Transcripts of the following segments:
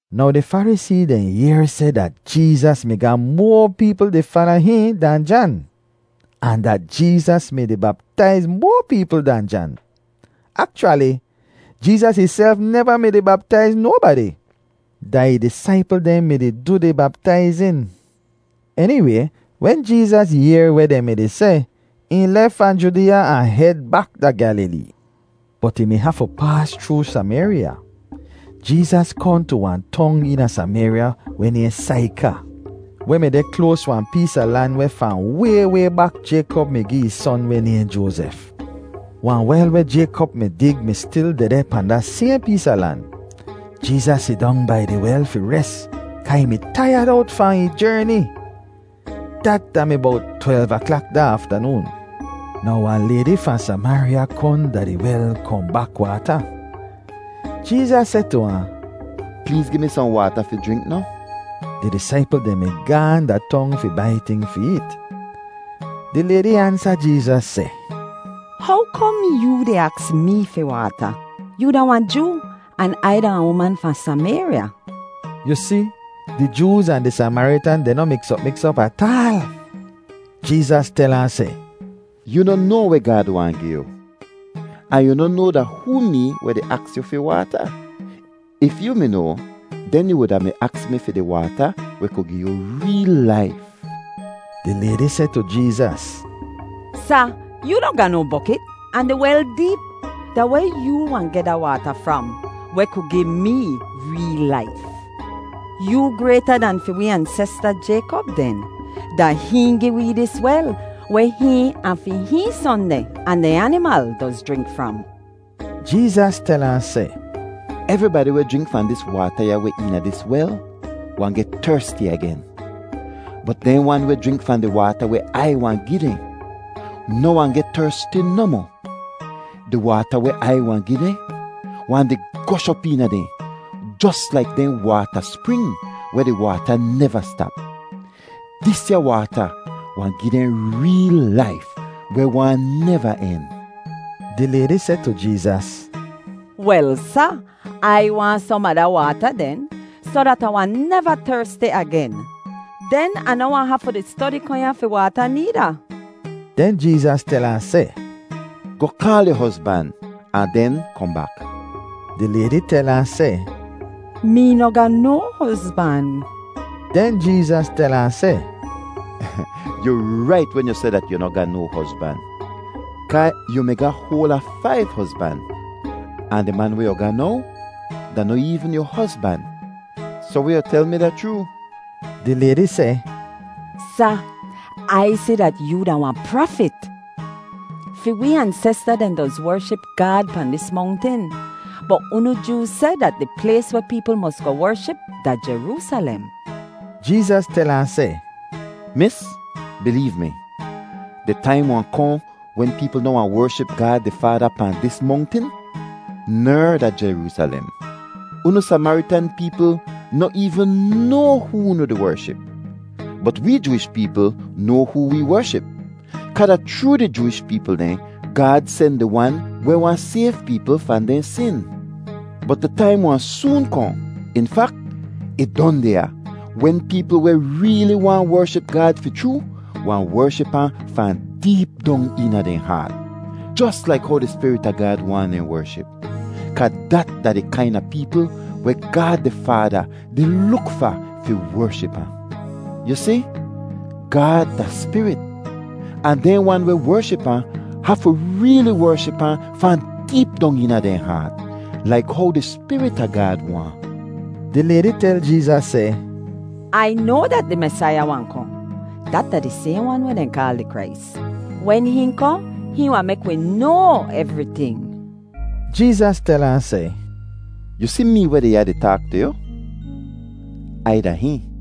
Now di Farisee dehn yehr seh dat Jeezas mi ga moa peepl di fala hihn dan Jan, ahn dat Jeezas mi-di baptaiz moa peepl dan Jan. Akchwali, Jeezas ihself neva mi-di baptaiz nobadi; da ih disaipl dehn mi-di du di baptaizin. Eniway, wen Jeezas yehr weh dehn mi-di seh, ih lef fahn Judeeya ahn hed bak da Gyalilee. Bot ih mi hafu paas chroo Samayrya. Jeezas kohn tu wahn tong eena Samayrya weh nayhn Saika, weh mi deh kloas wahn pees a lan weh fahn way way bak Jaykop mi gi ih son weh nayhn Joazef. Wahn wel weh Jaykop mi dig mi stil dehdeh pahn da sayhn pees a lan. Jeezas sidong bai di wel fi res kaa ih mi taiyad owt fahn ih jerni. Dat da mi bowt twelv aklak da aftanoon. Now wahn laydi fahn Samayrya kohn da di wel kohn bak waata. Jeezas seh tu ahn, “Pleez gi mi sohn waata fi jrink noh?” (Di disaipl dehn mi gaahn da tong fi bai ting fi eet.) Di laydi ansa Jeezas seh, “How kom yoo di aks mee fi waata? Yoo da wahn Joo, an Ai da wahn uman fahn Samayrya.” (Yu si, di Jooz ahn di Samaritan dehn noh miks op miks op ataal.) Jeezas tel ahn seh, “Yoo noh noa weh Gaad waahn gi yu, ahn yu noh noa da hoo mee weh di aks yu fi waata. If yoo mi noa, den yu wuda mi aks mi fi di waata weh ku gi yu reel laif.” Di laydi seh tu Jeezas, “Sa, yoo noh ga no bokit, ahn di wel deep. Da weh yoo wahn geh da waata fram, weh ku gi mee reel laif? Yoo grayta dan fi wee ansesta Jaykop den? Da hihn gi wee dis wel weh hihn, ahn fi hihn son dehn, ahn dehn animal doz jrink fram.” Jeezas tel ahn seh, “Evribadi weh jrink fahn dis waata ya weh deh eena dis wel wahn geh tersti agen. Bot dehn wan weh jrink fahn di waata weh Ai wahn gi dehn noh wahn geh tersti nohmoh. Di waata weh Ai wahn gi dehn wahn di gosh op eena dehn jos laik dehn waata spring weh di waata neva stap. Disya waata wahn gi dehn reel laif weh wahn neva en.” Di laydi seh tu Jeezas, “Wel, Sa, Ai waahn som a da waata den, soh dat Ah wahn neva tersti agen. Den Ah noh wahn hafu di stodi kohn ya fi waata needa.” Den Jeezas tel ahn seh, “Goh kaal yu hozban ahn den kohn bak.” Di laydi tel ahn seh, “Mee noh ga no hozban.” Den Jeezas tel ahn seh, “Yu rait wen yu seh dat yu noh ga no hozban; kaa yu mi ga hoal a faiv hozban, ahn di man weh yu ga now da noh eevn yu hozban. Soh weh yu tel mi da chroo!” Di laydi seh, “Sa, Ai si dat yoo da wahn prafit! Fi wee ansesta dehn doz wership Gaad pahn dis mongtin, bot unu Jooz seh dat di plays weh peepl mos goh wership da Jeroosalem.” Jeezas tel ahn seh, “Mis, bileev mi, di taim wahn kohn wen peepl noh wahn wership Gaad di Faada pahn dis mongtin ner da Jeroosalem. Unu Samaritan peepl noh eevn noa hoo unu di wership, bot wee Jooish peepl noa hoo wee wership, kaa da chroo di Jooish peepl dehn Gaad sen di Wan weh wahn sayv peepl fahn dehn sin. Bot di taim wahn soon kohn; in fak, ih don deh ya, wen peepl weh reeli waahn wership Gaad fi chroo wahn wership ahn fahn deep dong eena dehn haat, jos laik how di Spirit a Gaad waahn dehn wership; kaa dat da di kaina peepl weh Gaad di Faada di luk fa fi wership ahn. Yu si, Gaad da spirit, ahn dehn wan weh wership ahn hafu reeli wership ahn fahn deep dong eena dehn haat, laik how di Spirit a Gaad waahn.” Di laydi tel Jeezas seh, “Ai noa dat di Mesaiya wahn kohn.” (Dat da di sayhn wan weh dehn kaal di Krais.) “Wen hihn kohn, hihn wahn mek wi noa evriting.” Jeezas tel ahn seh, “Yu si mee weh deh ya di taak tu yu? Ai da hihn.”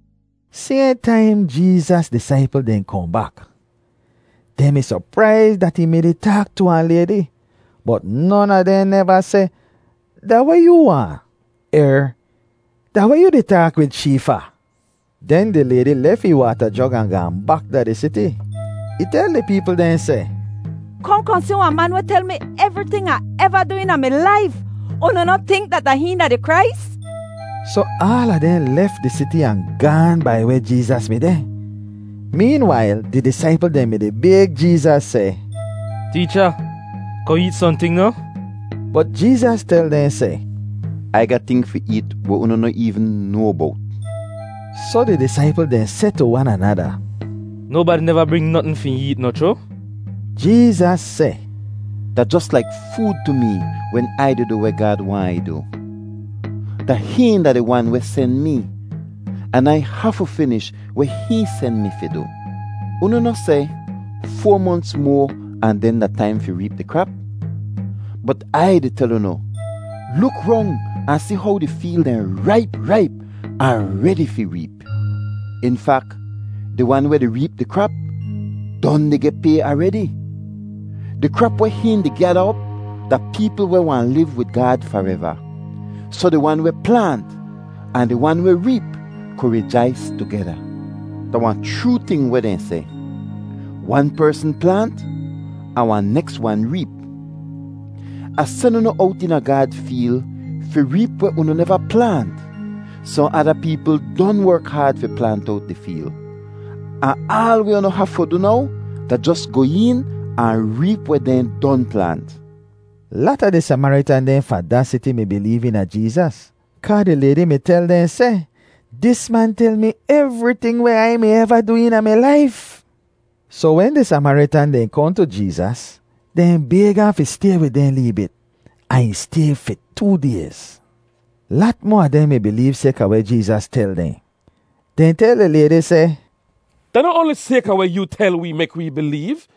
Sayhn taim Jeezas disaipl dehn kohn bak. Dehn mi sopraiz dat ih mi-di taak tu wahn laydi, bot non a dehn neva seh, “Da weh yoo waahn?” er “Da weh yoo di taak wid shee fa?” Den di laydi lef ih waata jog ahn gaahn bak da di siti. Ih tel di peepl dehn seh, “Kohn kohn si wahn man weh tel mi evriting Ah eva du eena mi laif! Unu noh tink dat da hihn da di Krais?” Soh aala dehn lef di siti ahn gaahn bai weh Jeezas mi deh. Meenwail di disaipl dehn mi-di bayg Jeezas seh, “Teecha, kohn eet sohnting noh?” Bot Jeezas tel dehn seh, “Ai ga ting fi eet weh unu noh eevn noa bowt.” Soh di disaipl dehn seh tu wan anada, “Nobadi neva bring notn fi hihn eet, noh chroo?” Jeezas seh, “Da jos laik food tu mee wen Ai di du weh Gaad waahn Ai du. Da hihn da di Wan weh sen mee, an Ai hafu finish weh hihn sen mi fi du. Unu noh seh, ‘Foa monts moa ahn den da taim fi reep di krap?’ Bot Ai di tel unu, luk rong ahn si how di feel dehn raip raip ahn redi fi reep. In fak, di wan weh di reep di krap don di geh pay aredi. Di krap weh hihn di gyada op da peepl weh wahn liv wid Gaad fareva; soh di wan weh plaant ahn di wan weh reep ku rijais tugeda. Da wahn chroo ting weh dehn seh, ‘Wan persn plaant, ahn wahn neks wan reep.’ Ah sen unu owt eena Gaad feel fi reep weh unu neva plaant. Sohn ada peepl don werk haad fi plaant owt di feel, ahn aal weh unu hafu du now da jos goh een ahn reep weh dehn don plaant.” Lata di Samaritan dehn fahn da siti mi bileev eena Jeezas kaa di laydi mi tel dehn seh, “Dis man tel mi evriting weh Ai mi eva du eena mi laif!” Soh wen di Samaritan dehn kohn tu Jeezas, dehn bayg ahn fi stay wid dehn lee bit, ahn ih stay fi too dayz. Lat moa a dehn mi bileev sayka weh Jeezas tel dehn. Dehn tel di laydi seh, “Da noh oanli sayka weh yoo tel wee mek wee bileev,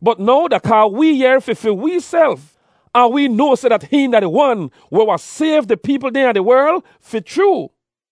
bot now da kaa wee yehr fi fi weeself, ahn wee noa seh dat hihn da di Wan weh wahn sayv di peepl dehn a di werl fi chroo.”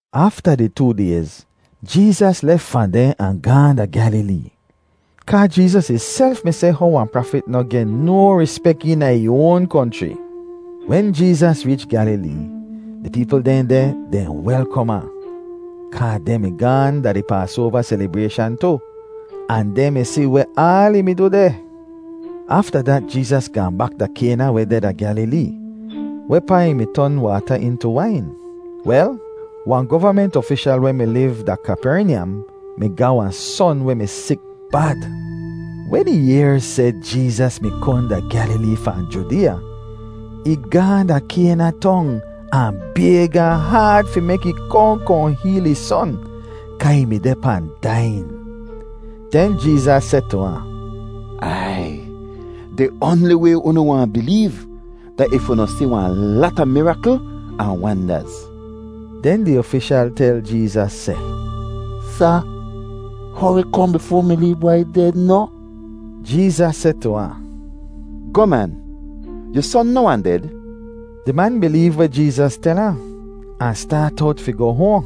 Afta di too dayz, Jeezas lef fahn deh ahn gaahn da Gyalilee. (Kaa Jeezas ihself mi seh how wahn prafit noh geh no rispek eena ih oan konchri.) Wen Jeezas reech Gyalilee, di peepl dehn deh dehn welkom ahn, kaa dehn mi gaahn da di Paasoava selibrayshan tu, ahn dehn mi si weh aal ih mi du deh. Afta dat Jeezas gaahn bak da Kayna weh deh da Gyalilee, wehpaa ih mi ton waata intu wain. Wel, wahn govament ofishal weh mi liv da Kapernyam mi ga wahn son weh mi sik bad. Wen ih yehr seh Jeezas mi kohn da Gyalilee fahn Judeeya, ih gaahn da Kayna Tong ahn bayg ahn haad fi mek ih kohn kohn heel ih son kaa ih mi deh pahn daiyin. Den Jeezas seh tu ahn, “Aiy, di oanli way unu wahn bileev da if unu si wahn lata mirakl ahn wandaz.” Den di ofishal tel Jeezas seh, “Sa, hori kohn bifoa mi lee bwai ded noh?” Jeezas seh tu ahn, “Goh man, yu son noh wahn ded.” Di man bileev weh Jeezas tel ahn, ahn staat owt fi goh hoahn.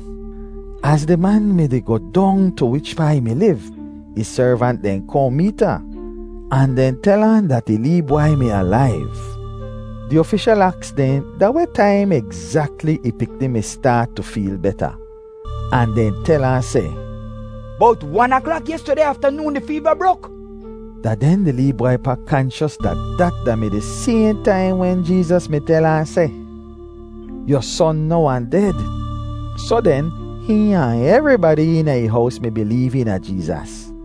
Az di man mi-di goh dong tu wichpaa ih mi liv, ih servant dehn kohn meet ahn, ahn dehn tel ahn dat ih lee bwai mi alaiv. Di ofishal aks dehn da weh taim egzakli ih pikni mi staat tu feel beta, ahn dehn tel ahn seh, “Bowt wan aklak yestudeh aftanoon di feeva brok.” Da den di lee bwai pa kanchos dat dat da-mi di sayhn taim wen Jeezas mi tel ahn seh, “Yu son noh wahn ded.” Soh den, hihn ahn evribadi eena ih hows mi bileev eena Jeezas.